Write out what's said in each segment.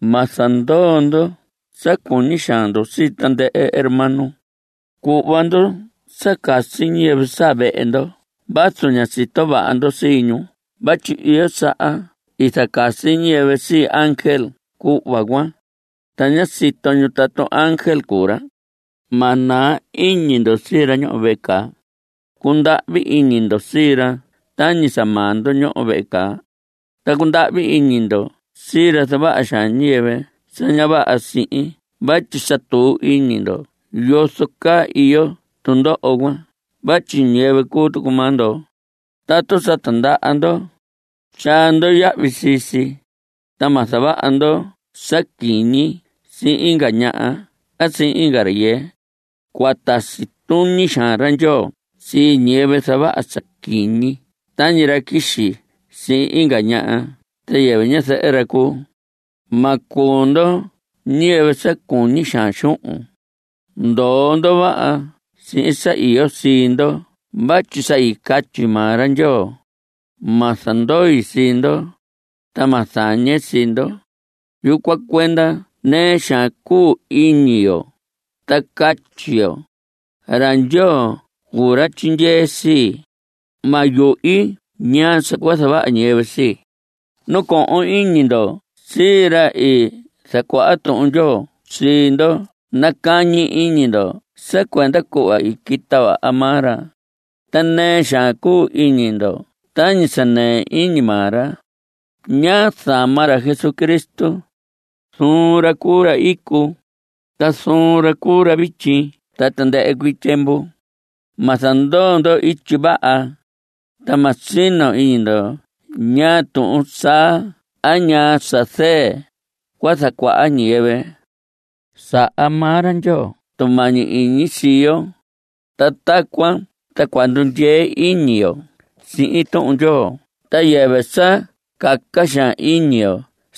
Ma zandoo ndo sa cuñi xaan ndo sii tandɨhɨ hermano. Cuhva ndo sa casi ñiyɨvɨ saa vehe ndo vazu ña sito vaha ndo sii ñu vatyi iyo saha i zacasi ñiyɨvɨ sii ángel cuhva cuan, ta ña sito ñu tatu ángel cuu ra. Ma naa iñi ndo sii ra ñoho vehe caa. Cundahvi iñi ndo sii ra tañi sa maa ndo ñoho vehe caa. Ta cundahvi iñi ndo sii ra zavaha xaan ñiyɨvɨ sa ña vaha sihin vatyi sa tuu iñi ndo yozo caa iyo tundoho cuan vatyi ñiyɨvɨ cuu tucu maa ndo. Tatu sa tindaha ndo, tyaa ndo yahvi sii si, ta ma zavaha ndo sa quiñi sihin inga ñaha a sihin inga rayɨɨ. Cua tasi tuñi xaan ra Ndyoo sii ñiyɨvɨ zavaha sa quiñi tañi ra quixi sihin inga ñaha sa yɨvɨ ñazɨhɨ ra cuu. Ma cuu ndo ñiyɨvɨ sa cuñi xaan xuhun. Ndoo ndo vaha sihin sa iyo sii ndo vatyi sa i catyi maa ra Ndyoo: “Ma zandoi sii ndo, ta ma zañe sii ndo.” Yucuan cuenda nɨɨ xaan cuu iñi yo ta catyi yo: Ra Ndyoo cuu ra tyindyee sii; Ma yuhi ñaa sa cua zavaha ñiyɨvɨ sii. Nacohon iñi ndo sii ra i zacuaha Tuhun Ndyoo sii ndo. Nacañi iñi ndo sa cuenda cuhva i quita vaha maa ra, ta nɨɨ xaan cuu iñi ndo tañi sa nɨɨ iñi maa ra. Ña záma ra Jesucristo. Zuun ra cuu ra icu, ta zuun ra cuu ra vityi ta tandɨhɨ cuii tyiemvu. Ma zandoo ndo ityi vaha, ta ma sino iñi ndo ñaa tuhun saa a ñaa sa zɨɨn cua zacuaha ñiyɨvɨ. Saha maa ra Ndyoo tumañi iñi sii yo, ta tacuan ta cua ndundyee iñi yo sihin Tuhun Ndyoo ta yɨvɨ sa caca xaan iñi yo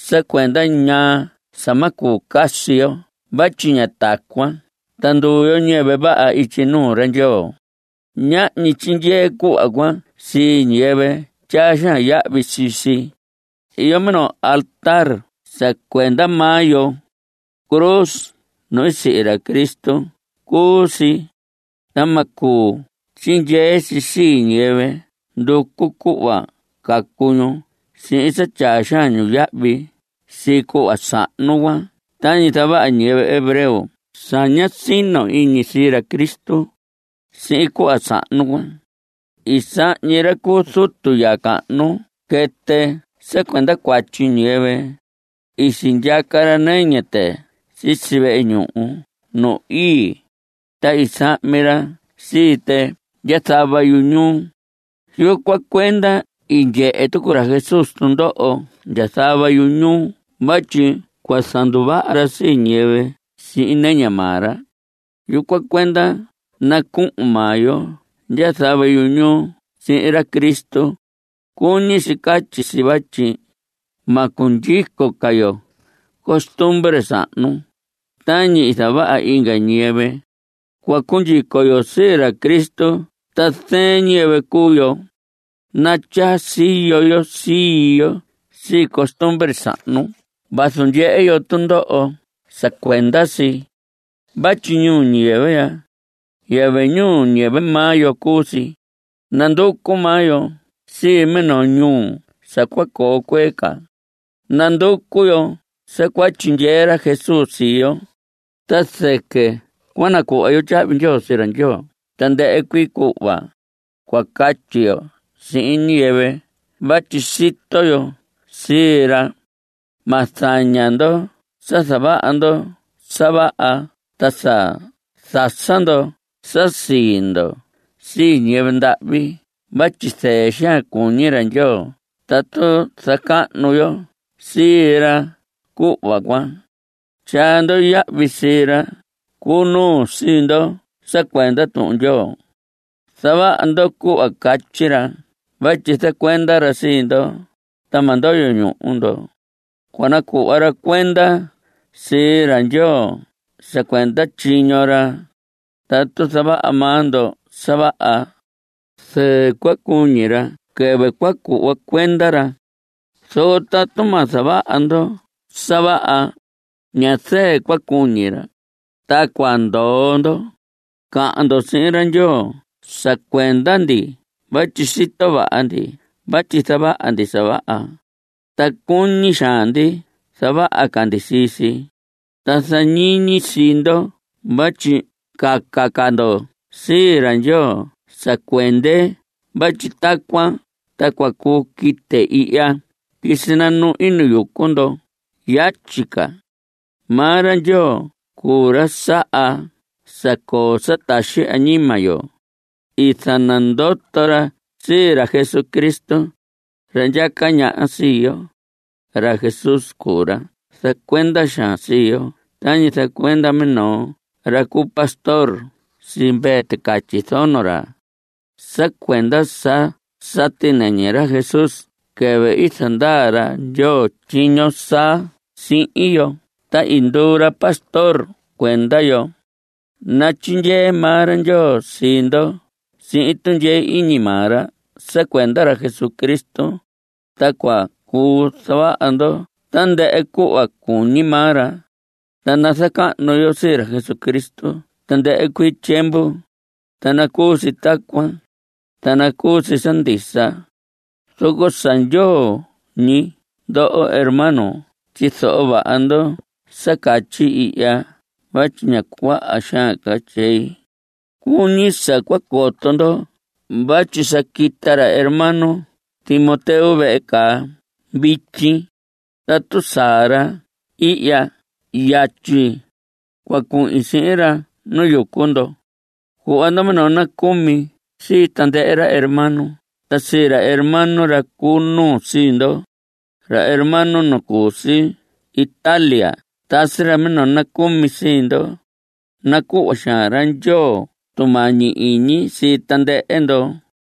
sa cuenda ñaa sa ma cuu casi yo vatyi ña tacuan ta nduu yo ñiyɨvɨ vaha ityi nuu ra Ndyoo. Ñahñi tyindyee cuhva cuan sii ñiyɨvɨ tyaa xaan yahvi sii si. Iyo minoo altar sa cuenda maa yo. Cruz nu i sihi ra Cristo cuu si. Ta ma cuu tyindyee si sii ñiyɨvɨ nducu cuhva cacu ñu sihin sa tyaa xaan ñu yahvi sii cuhva sahnu cuan tañi zavaha ñiyɨvɨ hebreo sa ña sino iñi sii ra Cristo. Sihin cuhva sahnu cuan, i sahñi ra cu zutu ya cahnu quɨtɨ sa cuenda cuatyi ñiyɨvɨ. I sindyaca ra nɨñɨ tɨ sisi vehe ñuhu nu ii, ta i sahmi ra sii tɨ ndya zava yuñuu. Yucuan cuenda i ndyehe tucu ra Jesús tundoho ndya zava yuñuu vatyi cua zanduvaha ra sii ñiyɨvɨ sihin nɨñɨ maa ra. Yucuan cuenda nacuhun maa yo ndya zava yuñuu sihin ra Cristo. (Cuñi si catyi si vatyi ma cundyico ca yo costumbre sahnu tañi zavaha inga ñiyɨvɨ. Cua cundyico yo sii ra Cristo ta zɨɨn ñiyɨvɨ cuu yo.) Natyaa siyo yo sii yo sii costumbre sahnu vazu ndyehe yo tundoho sa cuenda si. Vatyi ñuu ñiyɨvɨ ya; yɨvɨ ñuu maa yo cuu si; nanducu maa yo sii minoo ñuu sa cua coo cuee ca. Nanducu yo sa cua tyindyee ra Jesús sii yo, ta zɨquɨ cua nacuhva yo tyahvi ndyoo sii ra Ndyoo tandɨhɨ cuii cuhva. Cua catyi yo sihin ñiyɨvɨ vatyi sito yo sii ra. Ma zaña ndo sa zavaha ndo sa vaha ta sa zasa ndo sa sii ndo sii ñiyɨvɨ ndahvi vatyi zɨɨ xaan cuñi ra Ndyoo tatu zacahnu yo sii ra cuhva cuan. Tyaa ndo yahvi sii ra cu nuu sii ndo sa cuenda Tuhun Ndyoo. Zavaha ndo cuhva catyi ra vatyi zacuenda ra sii ndo ta ma ndoyo ñuhu ndo. Cua nacuhva ra cuenda sii ra Ndyoo sa cuenda tyiño ra. Tatu zavaha maa ndo sa vaha, zɨɨ cua cuñi ra quɨvɨ cua cuhva cuenda ra, zoco tatu ma zavaha ndo sa vaha, ña zɨɨ cua cuñi ra, ta cua ndoho ndo. Cahan ndo sihin ra Ndyoo sa cuenda ndi vatyi sito vaha ndi vatyi zavaha ndi sa vaha, ta cuñi xaan ndi zavaha ca ndi sii si. Ta zañiñi sii ndo vatyi caca ca ndo sii ra Ndyoo sa cuende vatyi tacuan ta cua cuu quite ihya ta quisi nanuhi nu yucu ndo yatyi ca. Maa ra Ndyoo cuu ra saha sa coo sa taxi añima yo. I zanandoto ra sii ra Jesucristo, ra ndyaca ñaha sii yo. Ra Jesús cuu ra zacuenda xaan sii yo tañi zacuenda minoo ra cu pastor sii mvee ticatyi zono ra. Sa cuenda sa i sati nɨñɨ ra Jesús quɨvɨ i zandaa ra Ndyoo tyiño saa sihin yo ta i nduu ra pastor cuenda yo. Natyindyee maa ra Ndyoo sii ndo sihin tundyee iñi maa ra sa cuenda ra Jesucristo, ta cua cuu zavaha ndo tandɨhɨ cuhva cuñi maa ra. Ta nazacahnu yo sii ra Jesucristo tandɨhɨ cuii tyiemvu. Ta nacuu si tacuan, ta nacuu si sa ndisa. Zoco sa ndyoo ñi ndoho hermanos tyizoho vaha ndo sa catyi ihya vatyi ña cuaha xaan tyei. Cuñi sa cua coto ndo vatyi sa quita ra hermano Timoteo vehe caa vityi. Tatu saa ra ihya yatyi, cua cuhin sihin ra nu yucu ndo. Cuhva ndo minoo nacumi sii tandɨhɨ ra hermano ta sii ra hermano ra cu nuu sii ndo. Ra hermano nu cu si Italia tasi ra minoo nacumi sii ndo. Nacuhva xaan ra Ndyoo tumañi iñi sii tandɨhɨ ndo.